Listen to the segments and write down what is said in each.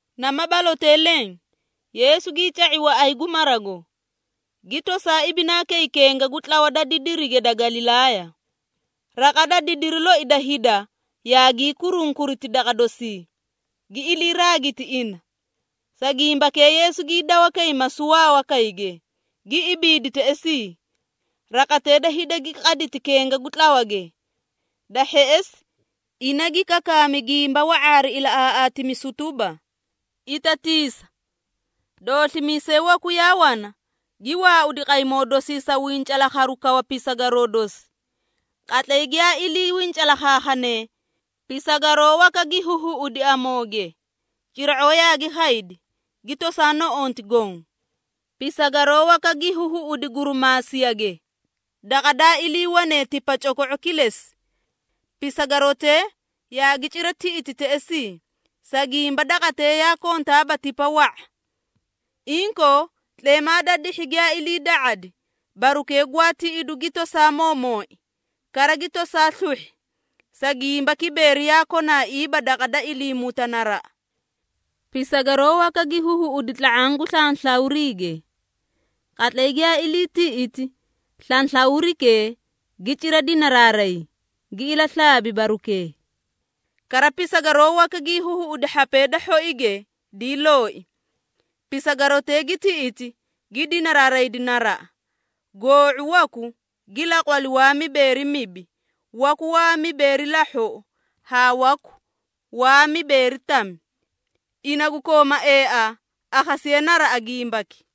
Nama balotee leẽ, Yeesu gii ca⁄i waꞌay gu marago, gi tosaa ibinaa kay kenga gu tlawa da didirige da Galilaaya. Raqa da didiri loi da hida yaagii kurunkuriti daqa dosii, gi ilii raagiti ina. Sa gimbakee Yeesu gii dawa kay masuwaa wakayge, gi ibiidi teꞌesii. Raqatee da hida gi qaditi kenga gu tlawage. Da hheꞌesi, ina gi kakaami gimba wa⁄a hari ilaꞌaaꞌaatimisu tuba, “Itatiisa! Dooslimiisay waku yaa wana gi waaudi qaymoo dosii sa wincalaakharu kawa pisagaroo dosi. Qatlay giyaa ilii wincalaakhaakhane, pisagaroo waka gi huhuꞌudi amooge, cira⁄oo yaagi khaydi, gi tosaa noꞌonti goõ. Pisagaroo waka gi huhuꞌudi gurumaasiyage, daqa daa iliiwane tipa coko⁄o kilesi. Pisagarotee yaagi cira tiꞌiti teꞌesii, sa gimba daqatee yaa kontaaba tipa wa⁄a. Inkoo, tleemaa da dihhi giyaa iliida⁄adi, barukee gwaa tiꞌidu gi tosaa moomooi, kara gi tosaa sluhhi, sa gimba kibeeri yaa konaaiiba daqa da iliimuta naraꞌa. Pisagaroo waka gi huhuꞌudi tla⁄aã gu slanslawriige. Qatlay giyaa ilii tiꞌiti, slanslawrikee gi cira dinaraaray, gi ilaslaabi barukee. Kara, pisagaroo waka gi huhuꞌudi hhapee da hhoige dii looi. Pisagarotee gi tiꞌiti, gi dinaraaraydi naraꞌa, goo⁄u waku gi laqwali waa mibeeri mibi, waku waa mibeeri lahhoꞌo, haa waku waa mibeeri tami. Ina gu kooma eaa, akhasiye naraꞌa gimbaki.”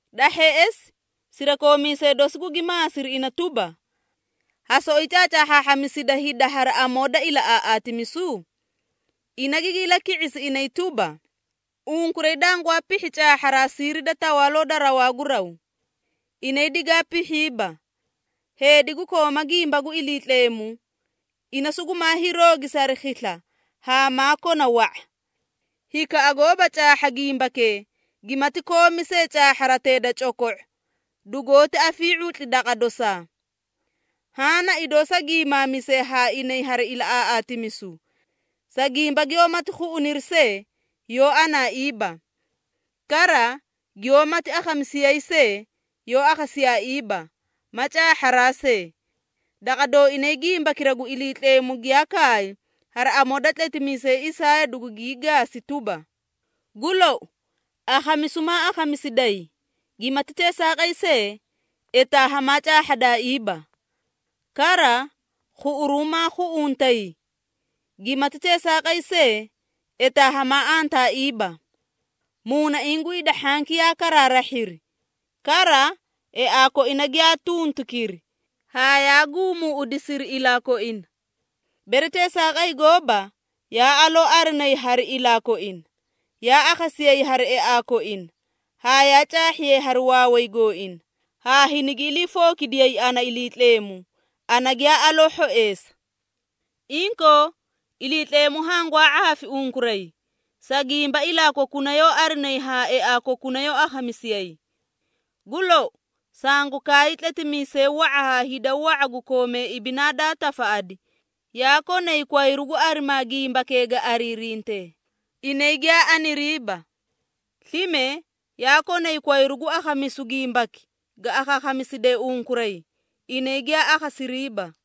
Da hheꞌesi, sirakoomiisee dosi gugi maasiri ina tuba, “Ha soꞌoyi caacaahhaahhamisida hida hari amoo da ilaꞌaaꞌaatimisu?” Ina gigi ilaki⁄isi inay tuba, “Unkuray dangwaa pihhi caahharaa siiri da Tawaaloo da rawaa gu raw. Inay digaa pihhiiba. Heedi gu kooma gimba gu Iliitleemu, ina sugumaa hiiroogisi hari khisla haa maa kona wa⁄a. Hikaꞌa goóba caahha gimbakee, gimati koomi see caahharatee da coko⁄o, dugoóti afii⁄utli daqa dosaa. Haã na idoo sa giimaamise haa inay hari ilaꞌaaꞌaatimisu, sa gimba giyoómati khuꞌuniri see, yoó anaaiiba. Kara, giyoómati akhamisiyayi see, yoó akhasiyaaiiba, ma caahharaa see. Daqa dooinay gimbakira gu Iliitleemu giyaa kaay hari amoo da tletimiisay Isaaya dugungii gaasi tuba, ‘Gu lou, akhamisu maa akhamisidayi, gimati teesaaqay see, etaa hamaa caahhadaaiiba. Kara, khuꞌuru maa khuꞌuntay, gimati teesaaqay see, etaa hamaa antaaiiba. Muunaiĩ gu hida hhanki yaa karaarahhiri. Kara, eaa koina giyaa tuntukiri, haa yaa guumuuꞌudisiri ilaa koina. Bere teesaaqay gooba, yaa aloo arinayi hari ilaa koina, yaa akhasiyayi hari eaa koina, haa yaa caahhiyay hari waaway gooina, haa hinigi iliifookidiyay ana Iliitleemu, ana giyaa aloo hhoeesa.’ Inkoo, Iliitleemu hangwaa ⁄aafi unkuray, sa gimba ilaa kokuna yoó arinayi haa eaa kokuna yoó akhamisiyayi. Gu lou, sangu kaay tletimiisee wa⁄a haa hida wa⁄a gu koomee ibinaa daa tafaꞌadi, yaa konay kwayru gu arimaa gimbakee ga ariirintee, inay giyaa aniriiba. Slime yaa konay kwayru gu akhamisu gimbaki ga akhaakhamiside unkuray, inay giyaa akhasiriiba.”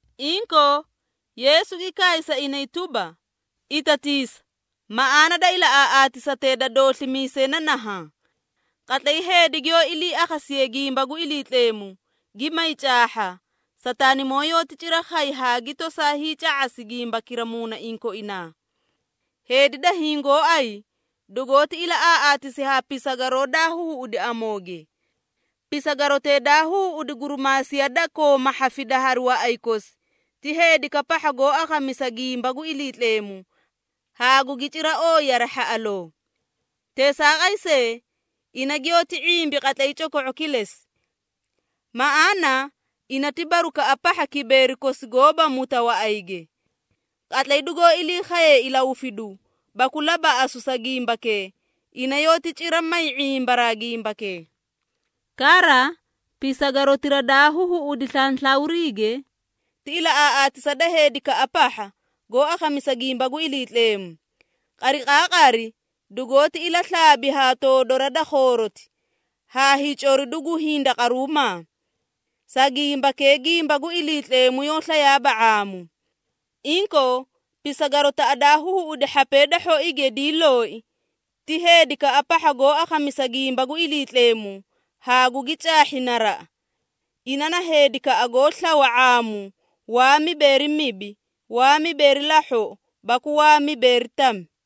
Inkoo, Yeesu gi kaay sa inay tuba, “Itatiisa! Maꞌaana da ilaꞌaaꞌaatisatee da dooslimiisay na nahaã. Qatlay heedi giyoó ilii akhasiye gimba gu Iliitleemu, gi may caahha, Sataanimoo yoóti cira khay haa gi tosaa hiica⁄asi gimbakira muunaiĩ koinaa. Heedi da hiĩ gooay, dugoóti ilaꞌaaꞌaatisi haa pisagaroo daa huhuꞌudi amooge. Pisagarotee daa huhuꞌudi gurimaasiya da kooma hhafida hari waꞌay kosi, ti heedikaꞌa pahha goó akhamisa gimba gu Iliitleemu haa gugi cira ooyi hari hhaꞌaloo. Teesaaqay see, ina giyoóti ⁄imbi qatlay coko⁄o kilesi, maꞌaana ina ti barukaꞌa pahha kibeeri kosi goóba muta waꞌayge. Qatlay dugoó ilii khaye ilahufidu baku labaꞌasu sa gimbakee, ina yoóti cira may ⁄imbaraa gimbakee. Kara, pisagarotira daa huhuꞌudi slanslawriige, ti ilaꞌaaꞌaatisa da heedikaꞌa pahha, goó akhamisa gimba gu Iliitleemu, qariqaaqari dugoóti ilaslaabi ha toodora da khooroti, haa hiicoridu gu hindaqaruumaa. Sa gimbakee gimba gu Iliitleemu yoó slayaaba ⁄aamu. Inkoo, pisagarotaꞌa daa huhuꞌudi hhapee da hhoige dii looi, ti heedikaꞌa pahha goó akhamisa gimba gu Iliitleemu haa gugi caahhi naraꞌa. Ina na heedikaꞌa goó slawa ⁄aamu waa mibeeri mibi, waa mibeeri lahhoꞌo, baku waa mibeeri tami.”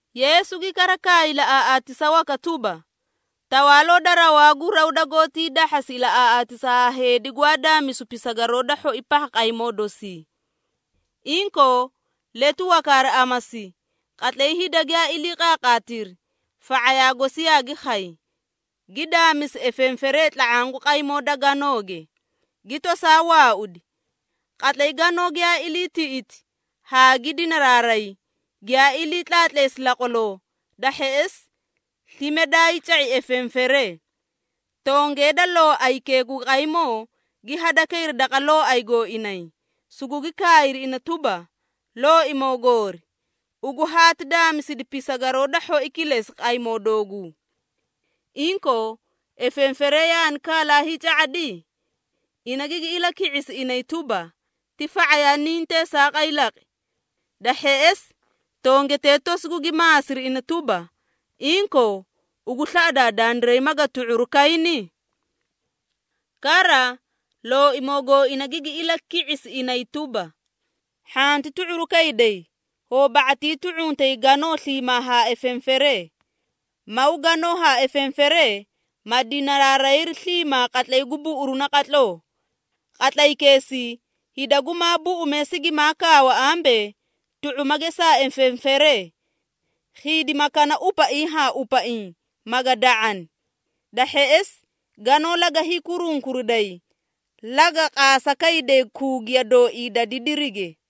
Yeesu gi kara kaay ilaꞌaaꞌaatisa waka tuba, “Tawaaloo da rawaa gu raw dagoóti hiidahhasi ilaꞌaaꞌaatisa haa heedi gwaa daamisu pisagaroo da hhoi pahha qaymoo dosii. Inkoo, letu waka hari amasi, qatlay hida giyaa ilii qaaqaatiri, fa⁄ayaa gosi yaagi khay, gi daamisi efenferee tla⁄aã gu qaymoo da ganooge, gi tosaa waaudi. Qatlay ganoo giyaa ilii tiꞌidi haa gi dinaraaray, giyaa ilii tlaatleesi laqwaloo, da hheꞌesi slime daay ca⁄i efenferee. Tongee da looaykee gu qaymoo gi hadakayri daqa looay gooinay, sugugi kaayri ina tuba, ‘Looimoo goori, ugu haati daamisidi pisagaroo da hhoi kilesi qaymoo dooguu. Inkoo, efenferee yaani kaalaa hiica⁄adi?’ Ina gigi ilaki⁄isi inay tuba, ‘Ti fa⁄ayaa niĩ teesaaqay laqi.’ Da hheꞌesi, tongetee tosi gugi maasiri ina tuba, ‘Inkoo, ugu slaꞌadaa dandiray maga tu⁄uru kayni?’ Kara, looimoo gooina gigi ilaki⁄isi inay tuba, ‘Hhanti tu⁄uru kayday, hoo ba⁄atii tu⁄untay ganoo sliimaa haa efenferee. Maw ganoo haa efenferee, ma dinaraarayri sliimaa qatlay gu buꞌuru naqatloo. Qatlaykeesii hida gumaa buꞌumee sigimaa kaawa ambee, tu⁄uma gesaa efenferee, khiidima kana upaiĩ haa upaiĩ, maga da⁄ani. Da hheꞌesi, ganoo laga hiikurunkuriday, laga qaasa kayday kuugiya dooii da didirige.’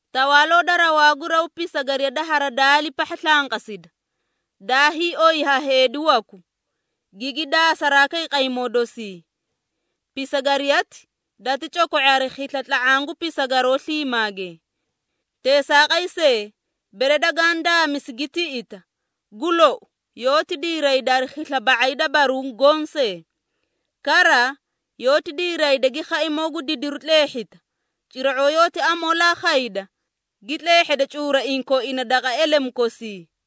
Tawaaloo da rawaa gu raw pisagariya da haradaali pahha slanqasi, daa hiioy ha heedi waku, gigi daasaraa kay qaymoo dosii. Pisagariyati dati coko⁄i hari khisla tla⁄aã gu pisagaroo sliimaage. Teesaaqay see, bere dagaã daamisi gi tiꞌita, gu lou yoóti diirayda hari khisla ba⁄ay da baruũ goõ see. Kara, yoóti diiray gi khaimoo gu didiru tleehhita, cira⁄oo yoóti amoolaa khayda gi tleehheda cuuraiĩ koina daqa elemu kosii.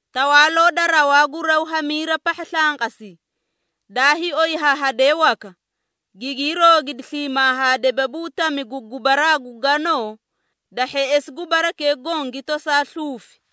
Tawaaloo da rawaa gu raw hamiira pahha slanqasi, daa hiioy ha hadee waka, gigii roogidi sliimaa haa debabuu tami gu gubaraa gu ganoo, da hheꞌesi gubarakee goõ gi tosaa sluufi.”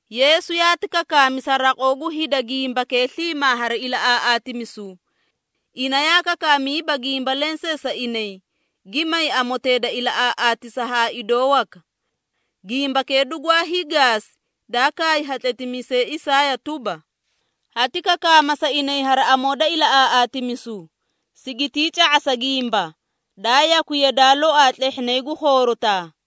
Yeesu yaati kakaami sa raqoo gu hida gimbakee sliimaa hari ilaꞌaaꞌaatimisu. Ina yaa kakaamiiba gimba lensee sa inay, gi may amotee da ilaꞌaaꞌaatisa haa idoo waka. Gimbakee dugwaa hiigaasi daa kaay ha tletimiisay Isaaya tuba, “Hati kakaama sa inay hari amoo da ilaꞌaaꞌaatimisu, sigitii ca⁄asa gimba, daa yakwi yadaa loaa tlehhinay gu khoorotaa.”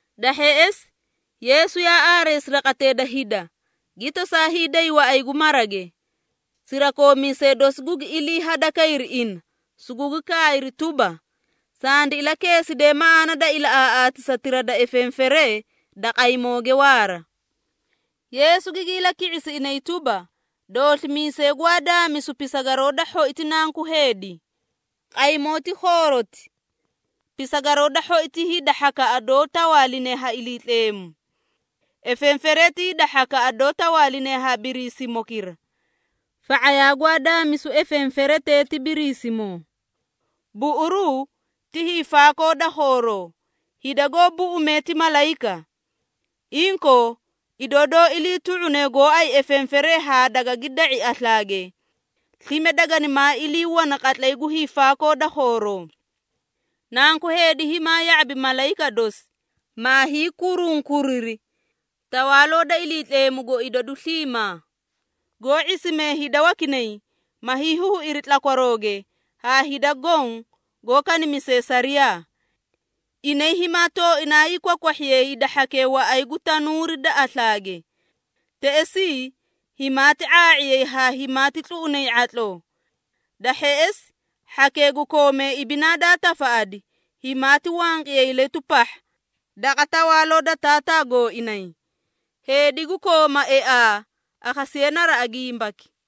Da hheꞌesi, Yeesu yaa aareesi raqatee da hida, gi tosaa hiiday waꞌay gu marage. Sirakoomiisee dosi gugi ilii hadakayri ina, sugugi kaayri tuba, “Sandi ilakeeside maꞌaana da ilaꞌaaꞌaatisatira da efenferee da qaymooge waara.” Yeesu gigi ilaki⁄isi inay tuba, “Dooslimiisay gwaa daamisu pisagaroo da hhoi ti Nanku Heedi. Qaymoo ti khooroti. Pisagaroo da hhoi ti hida hhakaꞌa doó tawaaline ha Iliitleemu. Efenferee ti hida hhakaꞌa doó tawaaline ha Biriisimokira. Fa⁄ayaa gwaa daamisu efenferetee ti Biriisimoo. Buꞌuruu ti hiifaakoo da khooroo, hida goó buꞌumee ti malayika. Inkoo, idoo doó ilii tu⁄une gooay efenferee haa dagagi da⁄i aslaage, slime daganimaa ilii wana qatlay gu hiifaakoo da khooroo. Nanku Heedi himaa ya⁄abi malayika dosi, maa hiikurunkuriri Tawaaloo da Iliitleemugo idadu sliimaa, goó ⁄isimee hida wakinay, ma hiihuuiri tlakwarooge haa hida goõ goó kanimisee sariyaa. Inay himaa tooinaa hiikwahhiyay hida hhakee waꞌay gu tanuuri da aslaage. Teꞌesii, himaati ⁄aa⁄iyay haa himaati tluꞌunay ⁄atloo. Da hheꞌesi, hhakee gu koomee ibinaa daa tafaꞌadi, himaati wanqiyay letu pahha daqa tawaaloo da Taataa gooinay. Heedi gu kooma eaa, akhasiye naraꞌa gimbaki.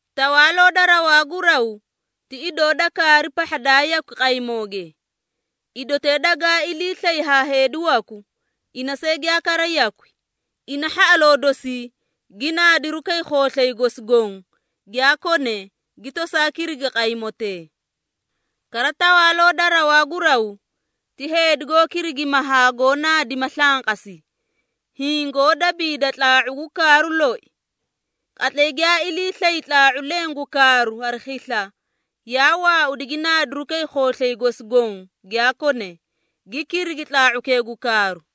Tawaaloo da rawaa gu raw ti idoo da kaari pahha daa yakwi qaymooge. Idotee dagaa ilii slay ha heedi waku, ina see giyaa kara yakwi. Ina hhaꞌaloo dosii gi naadiru kay khooslay gosi goõ giyaa kone, gi tosaa kirigi qaymotee. Kara, Tawaaloo da rawaa gu raw ti heedi goó kirigima haa goó naadima slanqasi, hiĩ goó dabiida tlaa⁄u gu kaaru loi. Qatlay giyaa ilii slay tlaa⁄u leẽ gu kaaru hari khisla, yaa waaudi gi naadiru kay khooslay gosi goõ giyaa kone, gi kirigi tlaa⁄ukee gu kaaru.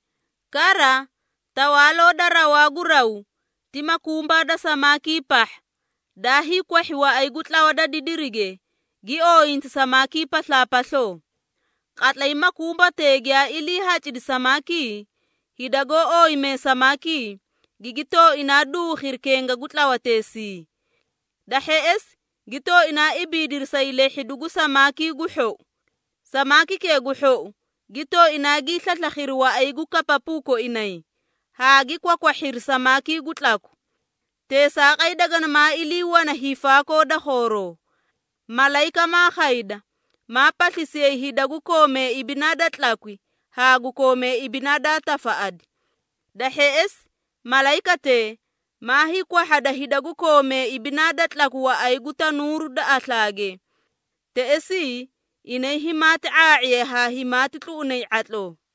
Kara, Tawaaloo da rawaa gu raw ti makumbaa da samaakii pahha, daa hiikwahhi waꞌay gu tlawa da didirige, gi ooyinti samaakii paslaapasloo. Qatlay makumbatee giyaa ilii hacidi samaakii, hida goó ooyimee samaakii, gigi tooinaa duukhiri kenga gu tlawateesii. Da hheꞌesi gi tooinaa ibiidiri sa hiilehhidu gu samaakii gu hhou. Samaakikee gu hhou gi tooinaa gii slaslakhiri waꞌay gu kapapuu koinay, haa gi kwakwahhiri samaakii gu tlaku. Teesaaqay daganimaa ilii wana hiifaakoo da khooroo. Malayika maa khayda, maa paslisiyay hida gu koomee ibinaa da tlakwi haa gu koomee ibinaa daa tafaꞌadi. Da hheꞌesi, malayikatee maa hiikwahhada hida gu koomee ibinaa da tlakwi waꞌay gu tanuuru da aslaage. Teꞌesii, inay himaati ⁄aa⁄iyay haa himaati tluꞌunay ⁄atloo.”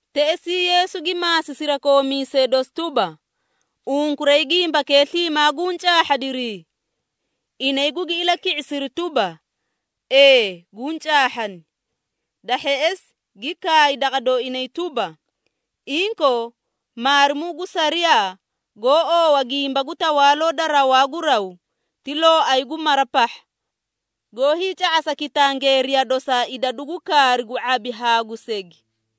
Teꞌesii Yeesu gi maasi sirakoomiisee dosi tuba, “Unkuray gimbakee sliimaa guũ caahhadirii?” Inay gugi ilaki⁄isiri tuba, “Ee guũ caahhani.” Da hheꞌesi gi kaay daqa dooinay tuba, “Inkoo, maarimuu gu sariyaa goó oowa gimba gu Tawaaloo da rawaa gu raw ti looay gu mara pahha, goó hiica⁄asa kitangeeriya dosaa idadu gu kaari gu ⁄abi haa gu segi.”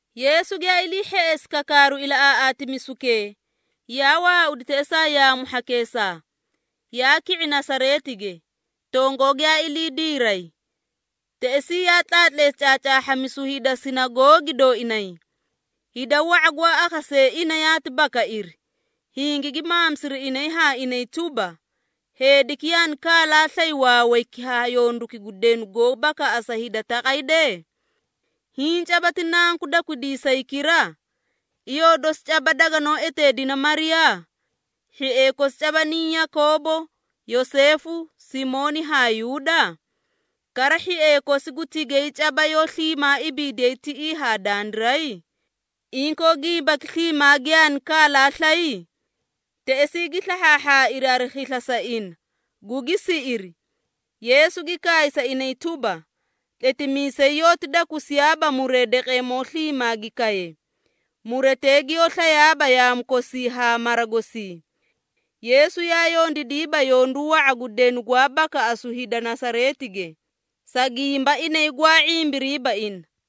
Yeesu giyaa ilii hheꞌesi kakaaru ilaꞌaaꞌaatimisukee, yaa waaudi teꞌesaa yaamu hhakeesaa, yaa ki⁄i Nasareetige, tongoo giyaa ilii diray. Teꞌesii yaa tlaatleesi caacaahhamisu hida sinagoogi dooinay. Hida wa⁄a gwaa akhasee ina yaati bakairi, hingigi maamisiri inay haa inay tuba, “Heediki yaani kaalaa slay waawayki haa yonduki gu denu goó bakaꞌasa hida taqay dee? Hiĩ caba ti nanku dakwidiisaykira? Iyoo dosi caba daganoó eteedina Mariyaa? Hhiee kosi caba niĩ Yakoobo, Yoseefu, Simooni haa Yuuda? Kara, hhiee kosi gu tigay caba yoó sliimaa ibiidiyay tiꞌii haa dandiray? Inkoo, gimbaki sliimaa giyaani kalaa slay?” Teꞌesii gi slahhaahhaairi hari khisla sa ina, gugi siꞌiri. Yeesu gi kaay sa inay tuba, “Tletimiisay yoóti dakusiyaaba muree daqeemoo sliimaa gi kaye, muretee giyoó slayaaba yaamu kosii haa mara gosii!” Yeesu yaa yondiidiiba yondu wa⁄a gu denu gwaa bakaꞌasu hida Nasareetige, sa gimba inay gwaa ⁄imbiriiba ina.